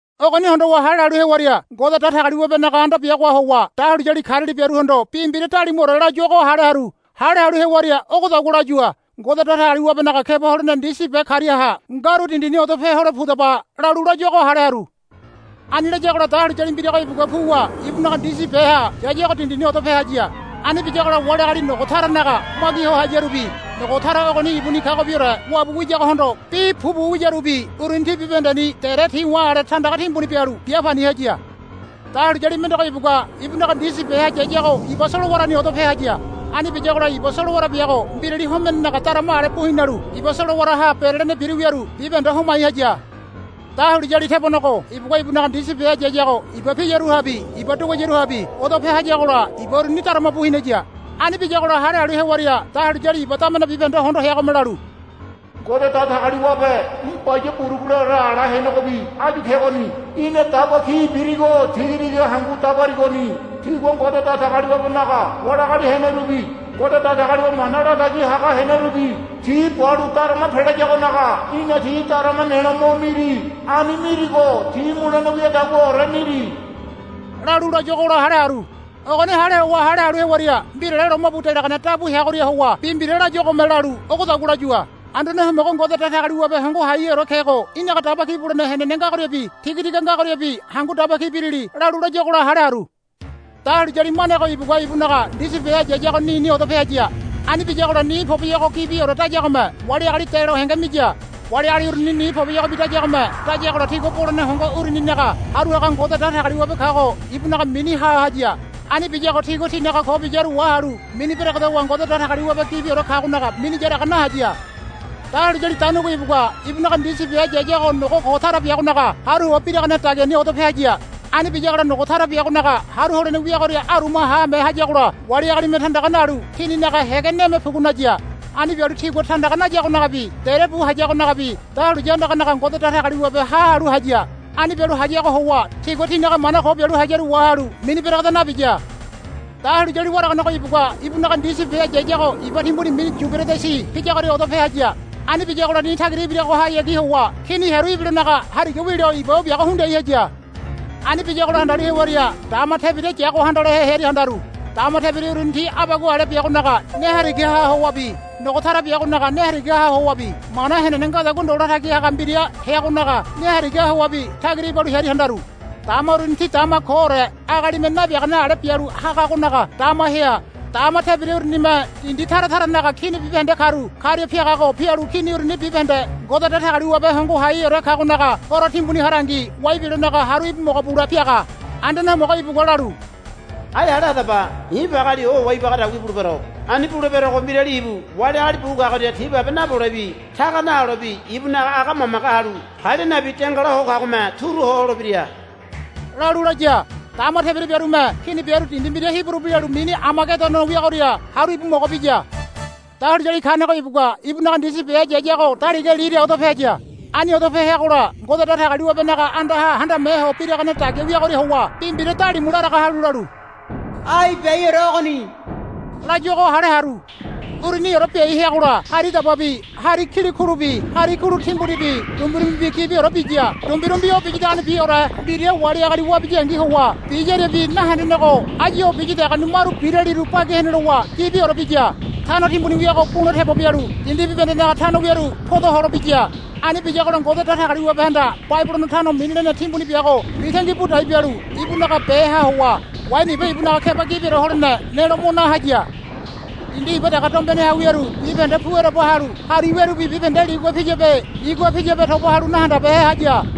Ogoni hondowa hale halu hewaria Ngode Datagaliwabenaga anda biagoha howa dahuliyali kariali biaruhondo bi mbira dalimuore layuago hale haru. Hale halu hewaria ogodagua layua. Ngode Datagaliwabenaga keba holene ndisi be kariaha ngaru dindini odope hole pudaba, lalu layuago hale haru. Ani layagola dahuliyali mbirago ibugua puwa ibunaga ndisi beha yayago dindini odope haya. Ani biyagola wali agali nogo taranaga magi ho hayarubi nogo tara ogoni ibuni kagobiore wabu wiyagohondo bi pupu wiyarubi uruni ti bibahendeni dere ti̱wa̱ ale tandaga timbuni bialu bia pani haya. Dahuliyali mendego ibugua ibunaga ndisi beha yayago iba solowarani odope haya. Ani biyagola iba solowara biago mbirali homenenaga darama ale bu hinalu iba solowaraha berelene biru wiaru bibahende homai haya. Dahuliyali tebonego ibugua ibunaga ndisi beha yayago iba piyaruriabi iba duguayaruriabi odope hayagola iba uruni darama bu hinaya. Ani biyagola hale halu hewaria dahuliyali iba damene bibahende hondo heagome lalu, Ngode Datagaliwabe í̠ Baya Buruguleore ala henegobi áyu kegoni. Í̠na daba ki birigo tiga tiga hangu dabarigoni. Tigua Ngode Datagaliwabenaga wali agali henerubi Ngode Datagaliwabe mana latagi haga henerubi ti balu darama pelayagonaga í̠na ti darama nelo mo miri. Ani mirigo ti mulene wiadaguaore miri, lalu layuagola hale haru. Ogoni hale howa hale halu hewaria mbirale lomabu delagane dabu heagoria howa bi mbira layuagome lalu ogodagua layua. Anduane Homogo Ngode Datagaliwabe Hongo Haiheore kego í̠naga daba ki bulene henene ngagoriabi tiga tiga ngagoriabi hangu daba ki birili, lalu layuagola hale haru. Dahuliyali manego ibugua ibunaga ndisi beha yayago nini odope haya. Ani biyagola ni poboyogo gibiore dayagome wali agali delo henge miya. Wali agali uruni ni poboyogobi dayagome dayagola tigua bolene hongo uruninaga haru haga Ngode Datagaliwabe kago ibunaga mini ha haya. Ani biyago tigua tinaga ko biyaru wahalu mini beregedowa Ngode Datagaliwabe gibiore kagonaga mini yaraga nahaya. Dahuliyali daunigo ibugua ibunaga ndisi beha yayago nogo ko tara biagonaga haru howa biragane dagiani odope haya. Ani biyagola nogo tara biagonaga haru holene wiagoria aruma haame hayagola wali agalime tandaga nalu tininaga hége neme pugu naya. Ani bialu tigua tandaga nayagonagabi dere bu hayagonagabi dahuliya andaganaga Ngode Datagaliwabe ha halu haya. Ani bialu hayago howa tigua tinaga mana ko bialu hayaru wahalu mini beregeda nabiya. Dahuliyali waraganego ibugua ibunaga ndisi beha yayago iba timbuni mini Yuberedisi piyagoria odope haya. Ani biyagola ni tagira ibiragohayagi howa kini hearu ibilonaga hariga wilo iba o biago hundiai haya. Ani biyagola handalu hewaria dama tebira yago handalehe hearia handaru. Dama tebira uruni ti abagua ale biagonaga ne harigaha howabi nogo tara biagonaga ne harigaha howabi mana henene ngadagua ndo latagi haga mbira heagonaga ne harigaha howabi tagira ibalu hearia handaru. Dama uruni ti dama koore agalime nabiagane ale bialu hagagonaga dama hea. Dama tebira urunime dindi tara taranaga kini bibahende karu karia piagago pialu kini uruni bibahende Ngode Datagaliwabe Hongo Haiheore kagonaga Horo timbuni harangi wai bilonaga haru íbu mogo bule piaga. Anduane Homogo ibugua lalu, Ai hale hadaba. I̱ pageali ohowa ibagadagua ibulebero. Ani buleberogo mbirali ibu wali agali bu kagoria ti babe napolebi taga naholebi ibunaga aga mamage halu palia nabi dengala ho kagome turu ho holebira, lalu laya. Dama tebira biarume kini biaru dindi mbira Hiburu bi lalu mini Amagedono wiagoria haru íbu mogo biya. Dahuliyali kanego ibugua ibunaga ndisi beha yayago daliga lira odope haya. Ani odope heagola Ngode Datagaliwabenaga andaha handame ho biragane dagia wiagoria howa bi mbira dalimu laraga halu lalu, Ai biaiore ogoni, layuago hale haru. Uruniore biai heagola hari dababi hari kilikulubi hari kulu timbunibi dumbirumbi gibiorebi biya. Dumbirumbi o biyadagonibiore mbira wali agali wabiniyangi howa biyariabi nahendenego áyu o biyadagoni maru biraliru bagi hene lowa gibiore biya. Tano timbuni wiago bu̱la tebo bialu dindi bibahendenaga tano wiaru poda holobiya. Ani biyagola Ngode Datagaliwabehanda Babilono tano mini lene timbuni biago mitangi bu dai bialu ibunaga beha howa waini iba ibunaga keba gibiore holene nelo mo na haya. Dindi iba dege dombeneha wiaru bibahende pu ereba halu hari wearubi bibahende ligua piyabe nigua piyabe toba halu nahandabehe haya.